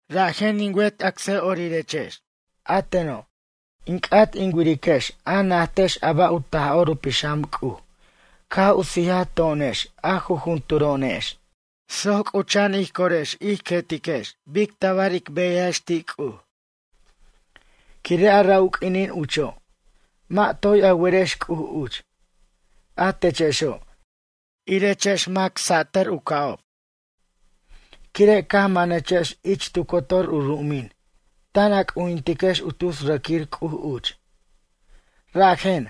Rajen in wet acsa'orirex, a teno', in c'at in wiriquex a najtex a ba' u Taj'or u Pixam C'uj caj u sijaj to'onex a jujunturo'onex, soc c'ucha'an ij corex ij querex bic tabar ic beyajex ti' C'uj. Quire' a ra' u q'uinin ucho', mʌ' toy a werex C'uj uch, a techexo', irechex mac satʌr u ca'ob, quire' caj manechex ich tu cotor u ru'umin tan a c'ujintiquex u tus rʌquir c'uj uch. Rajen,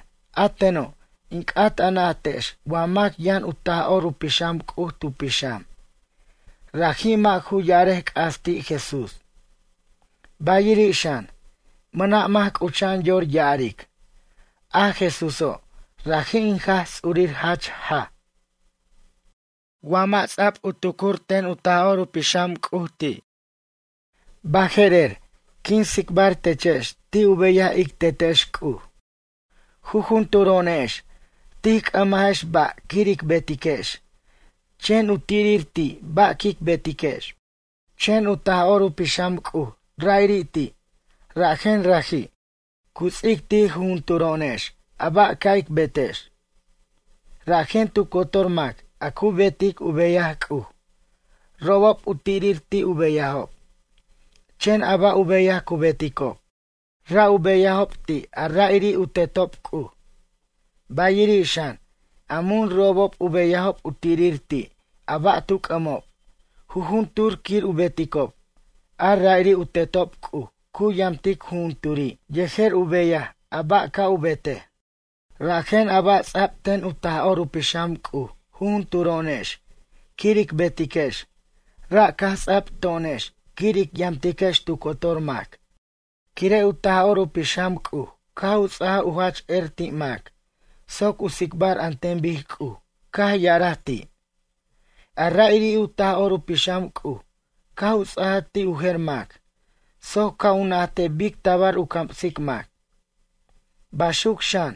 a teno', in c'at a najtex wa mac yʌn u Taj'or u Pixam C'uj tu pixam, raji' mʌ' ju ya'arej c'as ti' Jesús. Bayiri' xan, mʌna' mac cucha'an yor ya'aric: “A Jesúso', raji' in Jaj Ts'urir jach jaj.” Wa mʌ' ts'a'b u tucur ten u Taj'or u Pixam C'uj ti'. Baje'rer, quin tsicbar techex ti' u beyaj ic Tetex C'uj. Jujunturo'onex, tij c'ʌmajex ba' quir ic betiquex, chen u tirir ti' ba' quic betiquex. Chen a Taj'or u Pixam C'uj ra'iri' ti', rajen raji', cu ts'ic ti' jujunturo'onex a ba' ca' ic betex. Rajen tu cotor mac a cu betic u beyaj C'uj, robob u tirir ti' u beyajob, chen a ba' u beyaj cu beticob, ra' u beyajob ti' a ra'iri' u Tetob C'uj. Bayiri' xan, a mun robob u beyajob u tirir ti' a ba' tu c'ʌmob, jujuntur quir u beticob, a ra'iri' u Tetob C'uj cu yamtic jujunturi' yejer u beyaj a ba' ca' u betej. Rajen, a ba' ts'a'b ten u Taj'or u Pixam C'uj jujunturo'onex quir ic betiquex, ra' caj ts'ab to'onex quir ic yamtiquex tu cotor mac. Quire' u Taj'or u Pixam C'uj caj u ts'aj u jach er ti' mac soc u tsicbar an ten bic C'uj caj ya'araj ti'. A ra'iri' u Taj'or u Pixam C'uj caj u ts'aja ti' u jer mac soc ca' u najtej bic tabar u camsic mac. Baxuc xan,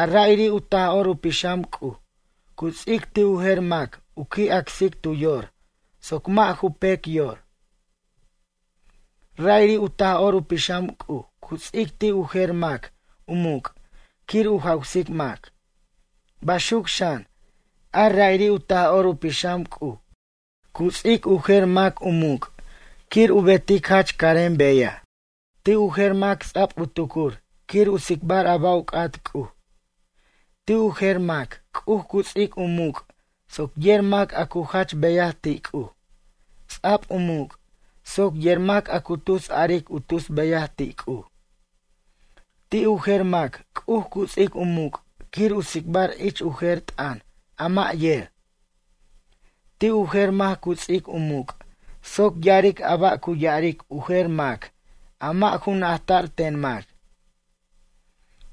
a ra'iri' u Taj'or u Pixam C'uj cu ts'ic ti' u jer mac u qui' acsic tu yor soc mʌ' ju pec yor. Ra'iri' u Taj'or u Pixam C'uj cu ts'ic ti' u jer mac u muc' quir u jawsic mac. Baxuc xan, a ra'iri' u Taj'or u Pixam C'uj cu ts'ic u jer mac u muc' quir u betic jach carem beyaj. Ti' u jer mac ts'ab u tucur quir u tsicbar a ba' u c'at C'uj. Ti' u jer mac C'uj cu ts'ic u muc' soc yer mac a cu jach beyaj ti' C'uj, ts'ab u muc' soc yer mac a cu tus aric u tus beyaj ti' C'uj. Ti' u jer mac C'uj cu ts'ic u muc' quir u tsicbar ich u jer t'ʌn a mʌ' yer. Ti' u jer mac cu ts'ic u muc' soc ya'aric a ba' cu ya'aric u jer mac a mʌ' ju najta'r ten mac.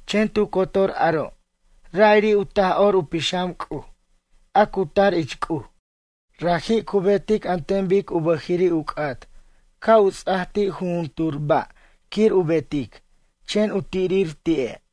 Chen tu cotor aro', ra'iri' u Taj'or u Pixam C'uj, a cu tar ich C'uj, raji' cu betic an ten bic u bʌjiri' u c'at ca' u ts'a ti' jujuntur ba' quir u betic, chen u tirir ti'e'.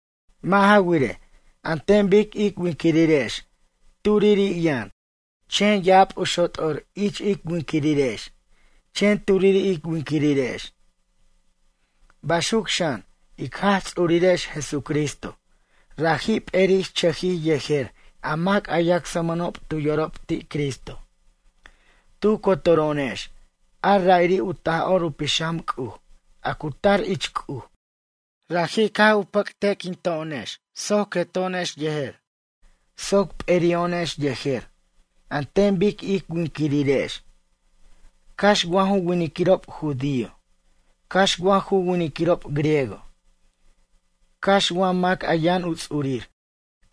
Mʌ' ja wirej, an ten bic ij winquirirex turiri' yʌn, chen ya'ab u xot'or ich ij winquirirex, chen turiri' ic winquirirex. Baxuc xan, ic Jaj Ts'urirex Jesucristo, raji' p'eri'chʌjij yejer a mac a yacsmʌnob tu yorob ti' Cristo. Tu cotoro'onex, a ra'iri' u Taj'or u Pixam C'uj, a cu tar ich C'uj, raji' caj u pʌcte'quin to'onex soc queto'onex yejer soc p'eri'o'onex yejer, an ten bic ij winquirirex, cax wa ju winiquirob judío, cax wa ju winiquirob griego, cax wa mac a yʌn u ts'urir,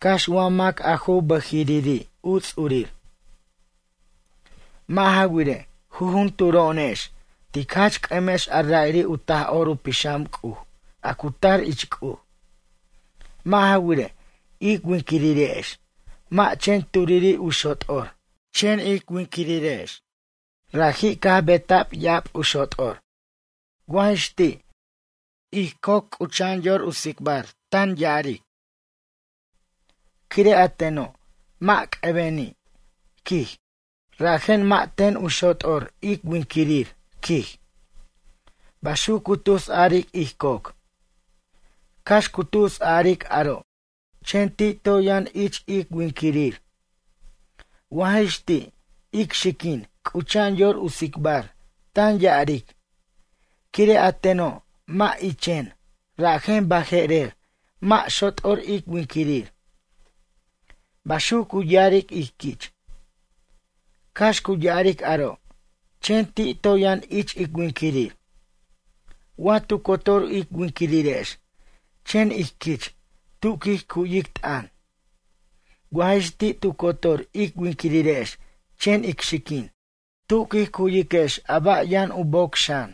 cax wa mac a ju bʌjiriri' u ts'urir. Mʌ' ja wirej, jujunturo'onex tic jach c'ʌmex a ra'iri' u Taj'or u Pixam C'uj, a cu tar ich C'uj. Mʌ' ja wirej, ic winquirirex mʌ' chen turiri' u xot'or, chen ic winquirirex raji' caj beta'b ya'ab u xot'or. Wa jix ti', ij coc c'ucha'an yor u tsicbar, tan ya'aric: “Quire' a teno', mʌ' c'ʌbeni', quij, rajen mʌ' ten u xot'or ic winquirir”, quij. Baxuc cu tus a'aric ij coc. Cax cu tus a'aric aro', chen ti' toy yʌn ich ic winquirir. Wa jix ti', ic xiquin cucha'an yor u tsicbar, tan ya'aric: “Quire' a teno', mʌ' ichen, rajen baje'rer, mʌ' xot'or ic winquirir.” Baxuc cu ya'aric ij quich. Cax cu ya'aric aro', chen ti' toy yʌn ich ic winquirir. Wa tu cotor ic winquirirex chen ij quich, tu quij cuyic t'ʌn? Wa jix ti' tu cotor ic winquirirex chen ic xiquin. Tu quij cuwiquex a ba' yʌn u boc xan?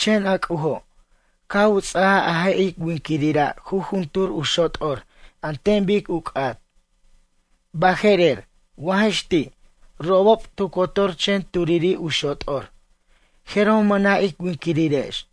Chen a C'ujo', caj u ts'ajaj a je' ic winquirira' jujuntur u xot'or an ten bic u c'at. Baje'rer, wa jix ti', robob tu cotor chen turiri' u xot'or, jeroj mʌna' ic winquirirex.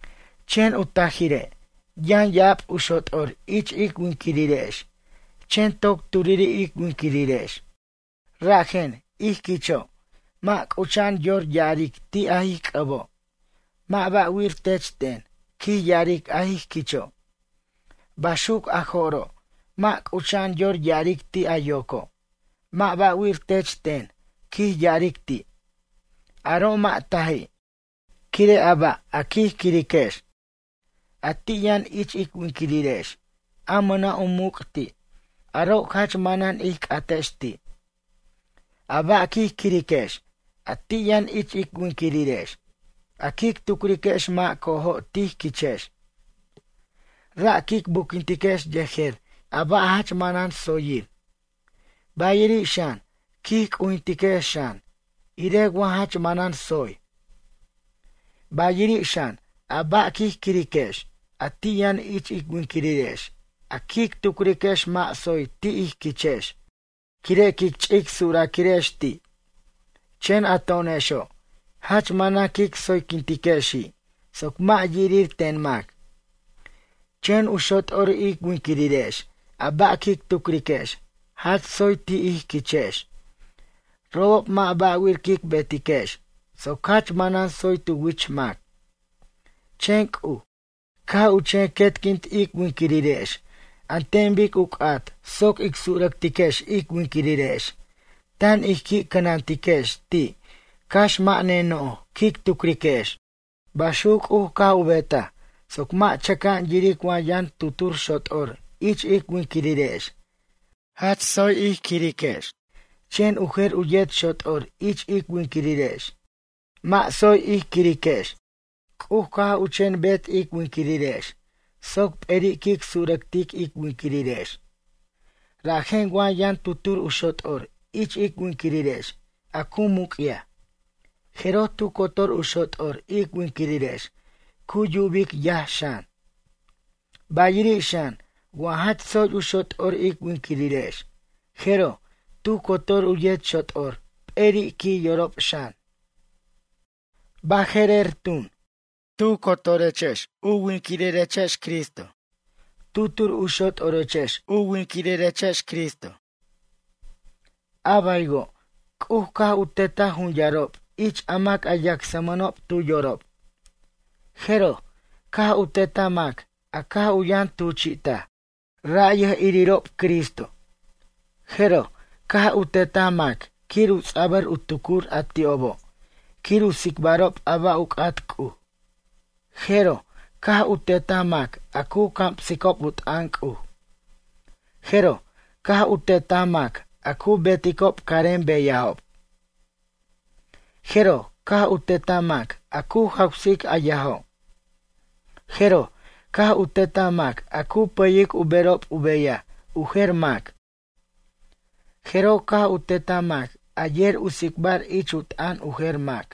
Chen u tajire', yʌn ya'ab u xot'or ich ic winquirirex, chen toc turiri' ic winquirirex. Rajen, ij quicho', mʌ' c'ucha'an yor ya'aric ti' a ij c'ʌbo': “Mʌ' ba'wir tech ten, quij ya'aric a ij quicho'.” Baxuc a jo'ro', mʌ' c'ucha'an yor ya'aric ti' a yoco': “Mʌ' ba'wir tech ten, quij ya'aric ti'.” Aro' mʌ' taji', quire' a ba' a quij quiriquex, a ti' yʌn ich ic winquirirex, a mʌna' u muc' ti', aro' jach manan ij c'atex ti'. A ba' quij quiriquex, a ti' yʌn ich ic winquirirex, a quic tucriquex mʌ' co'ojo' tij quichex. Ra' quic buquintiquex yejer a ba' jach manan tsoyir. Bayiri' xan, quij cujintiquex xan, irej wa jach manan tsoy. Bayiri' xan, a ba' quij quiriquex, a ti' yʌn ich ic winquirirex, a quic tucriquex mʌ' tsoy ti' ij quichex, quire' quic ch'ic suraquirex ti'. Chen a to'onexo' jach manan quic tsoyquintiquexi' soc mʌ' yirir ten mac. Chen u xot'or ic winquirirex a ba' quic tucriquex jach tsoy ti' ij quichex, robob mʌ' ba'wir quic betiquex soc jach manan tsoy tu wich mac. Chen C'uj, caj u chen quetquint ic winquirirex an ten bic u c'at soc ic surʌctiquex ic winquirirex, tan ij qui' cʌnantiquex ti' cax mʌ' ne noj quic tucriquex. Baxuc C'uj caj u betaj soc mʌ' chʌca'an yiric wa yʌn tutur xot'or ich ic winquirirex jach tsoy ij quiriquex chen u jer u yet xot'or ich ic winquirirex mʌ' tsoy ij quiriquex. C'uj caj u chen bet ic winquirirex soc p'eri' quic surʌctic ic winquirirex. Rajen wa yʌn tutur u xot'or ich ic winquirirex a cu muc'yaj, jeroj tu cotor u xot'or ic winquirirex cu yubic yaj xan. Bayiri' xan wa jach tsoy u xot'or ic winquirirex, jeroj, tu cotor u yet xot'or p'eri' qui' yorob xan. Baje'rer tun, tu cotorechex u winquirirechex Cristo, tutur u xot'orechex u winquirirechex Cristo. A baywo', C'uj caj u tetaj jun yarob ich a mac a yacsmʌnob tu yorob. Jeroj, caj u tetaj mac a caj u yʌn tuchi'taj, ra' yʌj'irob Cristo. Jeroj, caj u tetaj mac quir u ts'abʌr u tucur a ti'obo', quir u tsicbarob a ba' u c'at C'uj. Jeroj, caj u tetaj mac a cu camsicob u t'ʌn C'uj. Jeroj, caj u tetaj mac a cu beticob carem beyajob. Jeroj caj u tetaj mac a cu jawsic a yajo'. Jeroj, caj u tetaj mac a cu pʌyic u berob u beyaj u jer mac. Jeroj caj u tetaj mac a yer u tsicbar ich u t'ʌn u jer mac.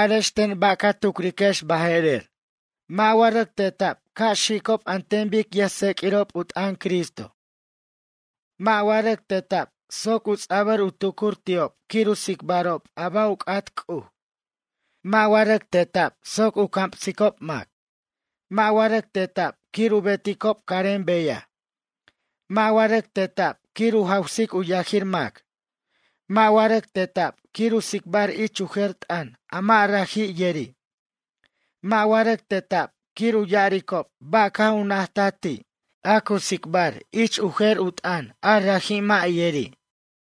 Arex ten ba' ca tucriquex baje'rer. Rʌc teta'b wa ca' xicob an ten bic yʌjtseq'uirob t'ʌn Cristo? Mʌ'. Rʌc teta'b soc ts'abʌr u tucur ti'ob quir u tsicbarob a ba' u c'at C'uj? Mʌ'. Rʌc teta'b wa soc u camsicob mac? Mʌ'. Rʌc teta'b wa quir u beticob carem beyaj? Mʌ'. Rʌc teta'b wa quir u jawsic u yajir mac? Mʌ'. Rʌc teta'b wa quir u tsicbar ich u jer t'ʌn a mʌ' raji' yeri'? Mʌ'. Rʌc teta'b wa quir u ya'aricob ba' caj u najtaj ti', a cu tsicbar ich u jer u t'ʌn a raji' mʌ' yeri'? Mʌ'.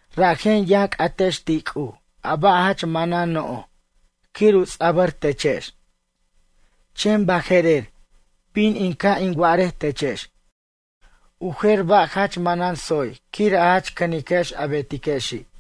Rajen yʌn c'atex ti' C'uj a ba' jach manan noj quir u ts'abʌr techex. Chen baje'rer, bin in ca' in wa'arej techex u jer ba' jach manan tsoy quir a jach cʌniquex a betiquexi'.